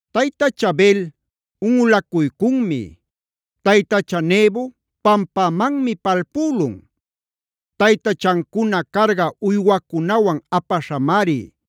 ¡Taytacha Bel unꞌulacuycunmi! ¡Taytacha Nebo pampämanmi palpülun! Taytachancuna carga uywacunawan apaśhamari.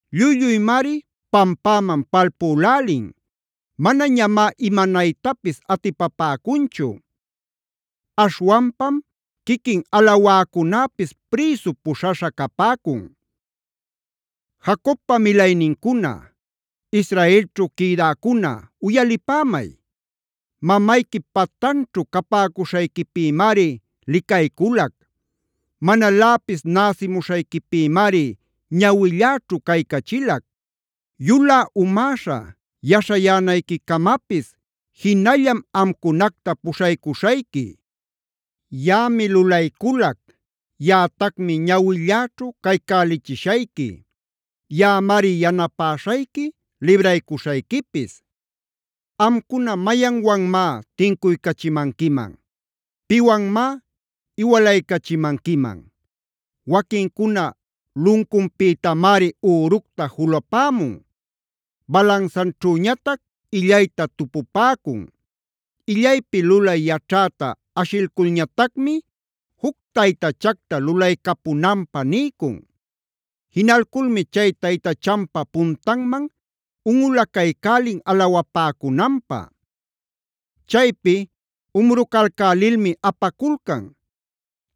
Lluy-lluymari pampäman palpülälin; manañamá imanaytapis atipapäcunchu. Aśhwanpam quiquin alawäcunäpis prïsu puśhaśha capäcun. Jacobpa milaynincuna, Israelćhu quïdäcuna uyalipämay: Mamayquip patanćhu capäcuśhayquipïmari licayculac; manaläpis näsimuśhayquipïmari ñawilläćhu caycachilac. Yulä umäśha yaśhayänayquicamapis jinallam amcunacta puśhaycuśhayqui. Yaꞌami lulayculac; yaꞌatacmi ñawilläćhu caycälichishayqui; yaꞌamari yanapäśhayqui, libraycuśhayquipis. Amcuna, ¿mayanwanmá tincuycachimanquiman? ¿Piwanmá iwalaycachimanquiman? Waquincuna luncunpïtamari üructa julupämun; balansaćhüñatac illayta tupupäcun. Illaypi lulay yaćhäta ashilculñatacmi juc taytachacta lulaycapunanpä niycun. Jinalculmi chay taytachanpa puntanman unꞌulacaycälin alawapäcunanpä. Chaypi umrucalcälilmi apaculcan;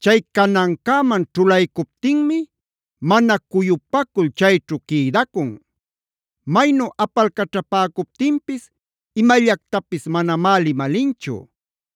chay canancäman ćhulaycuptinmi mana cuyupacul chayćhu quïdacun. Maynu apalcaćhapäcuptinpis imallactapis manamá limalinchu;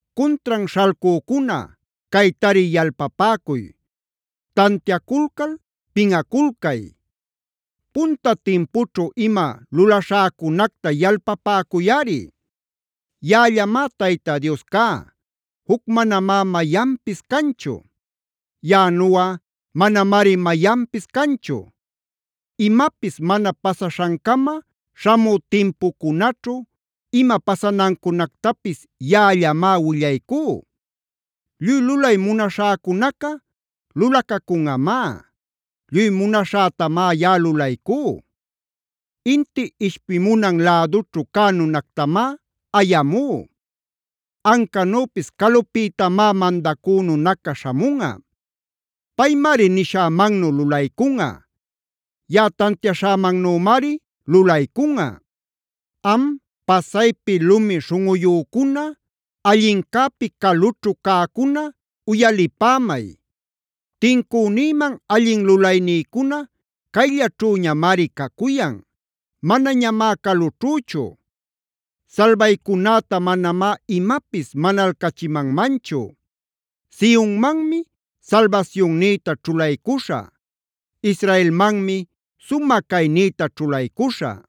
Cuntran śhalcücuna, caytari yalpapäcuy; tantiaculcal pinꞌaculcay. Punta timpućhu ima lulaśhäcunacta yalpapäcuyꞌari. Yaꞌallamá Tayta Dios cá; juc manamá mayanpis canchu. Yaꞌanuꞌa manamari mayanpis canchu. Imapis mana pasaśhancama śhamü timpucunaćhu ima pasanancunactapis yaꞌallamá willaycú. Lluy lulay munaśhäcunaca lulacacunꞌamá; lluy munaśhätamá yaꞌa lulaycú. Inti ishpimunan lädućhu cä nunactamá ayamú; ancanüpis calupïtamá mandacü nunacac śhamunꞌa. Paymari nishämannu lulaycunꞌa; yaꞌa tantiaśhämannümari lulaycunꞌa. Am, pasaypi lumi śhunꞌuyücuna, allincäpi calućhu cäcuna uyalipämay. Tincünïman allin lulaynïcuna cayllaćhüñamari cacuyan; manañamá calućhüchu. Salbaycunäta manamá imapis manalcachimanmanchu. Sionmanmi salbasyunnïta ćhulaycuśhä; Israelmanmi sumä caynïta ćhulaycuśhä.